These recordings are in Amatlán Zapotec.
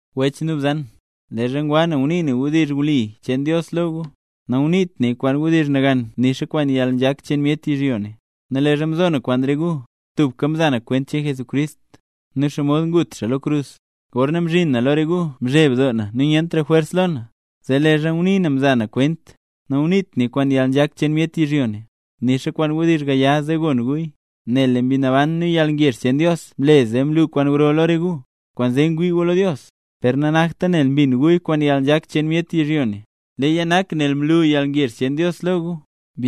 Wech nu bzan, leezha ngwa na ngunii na wdizh wli cheen Dios lo gu, nanguniit naya kwaan wdizh nagan nixa kwaan yalnzhak cheen myet yizhyo ne. Nu leezha mzo na kwaan re gu, tubka mza na kwent cheen Jesucrist, nel xomod ngut xaa lo krus. Gorna mzhin na lo re gu mzheb doo na nu nyentra jwers lo na, zee leezha ngunii na mza na kwent, nanguniit naya kwaan yalnzhak cheen myet yizhyo ne, nixa kwaan wdizh gaya zee gon guya. Nel lee Mbi Naban nu yalngezh cheen Dios mle zee mlu kwaan gro lo re gu. Kwaanzee ngwii gu lo Dios, per nanakta nel mbin guya kwaan yalnzhak cheen myet yizhyo ne, leeya nak nel mla yalngezh cheen Dios lo gu.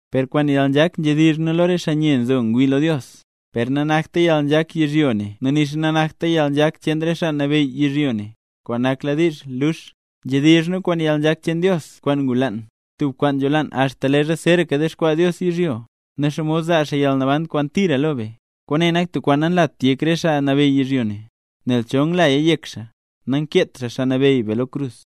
Per kwaan yalnzhak nzhedizh nu lo re xaa nye nzo ngwii lo Dios, per nanakta yalnzhak yizhyo ne nu nixa nanakta yalnzhak cheen re xaa nabeyy yizhyo ne, kwaan nakladiizh lux. Nzhedizh nu kwaan yalnzhak cheen Dios kwaan ngulaan, tub kwaan nzholaanla axta leezha zeeraka dexkwaa Dios yizhyo, nen xomod zaa xaa yalnaban kwaan tira lo be. Kwaane nak tub kwaan nanlat yek re xaa nabeyy yizhyo ne, nel chol nglaya yek xaa, nangkeet xaa Xaa Nabeyy be lo krus.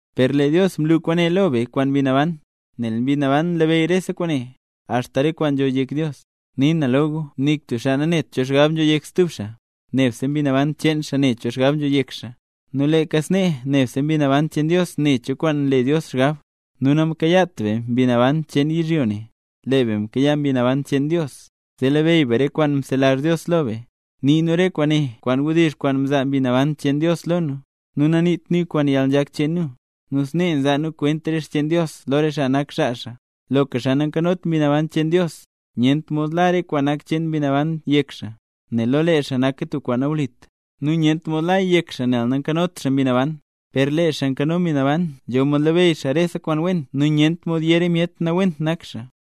Per lee Dios mlu kwaane lo be kwaan Mbi Naban, nel Mbi Naban nlabeyy rese kwaane, axta re kwaan nzho yek Dios. Nii na lo gu, nik tub xaa nanet cho xgab nzho yek stub xaa, nebse mbi naban cheen xaa ne cho xgab nzho yek xaa. Nu leeka snee nebse Mbi Naban cheen Dios ne cho kwaan nle Dios xgab. Nu namkayaat be mbi cheen yizhyo ne, lee be mkayaa Mbi Naban cheen Dios, zee labeyy be re kwaan mzelazh Dios lo be. Nii nu re kwaane kwaan wdizh kwaan mzaa Mbi Naban cheen Dios lo nu, nu naniit nuya kwaan yalnzhak cheen nu. Nu snee nzaa nu kwent re xcheen Dios lo re xaa nak xaa xaa. Loka xaa nayot Mbi Naban cheen Dios lextoo, nyent mod la re kwaan nak cheen Mbi Naban yek xaa, nel lo lee xaa naka tub kwaan nawlit. Nu nyent mod laya yek xaa nel nanzhot xaa Mbi Naban lextoo xaa. Per lee xaa kwaan nzho Mbi Naban lextoo xaa, nzho mod labeyy xaa rese kwaan wen nu nyent mod yé re myet nawent nak xaa.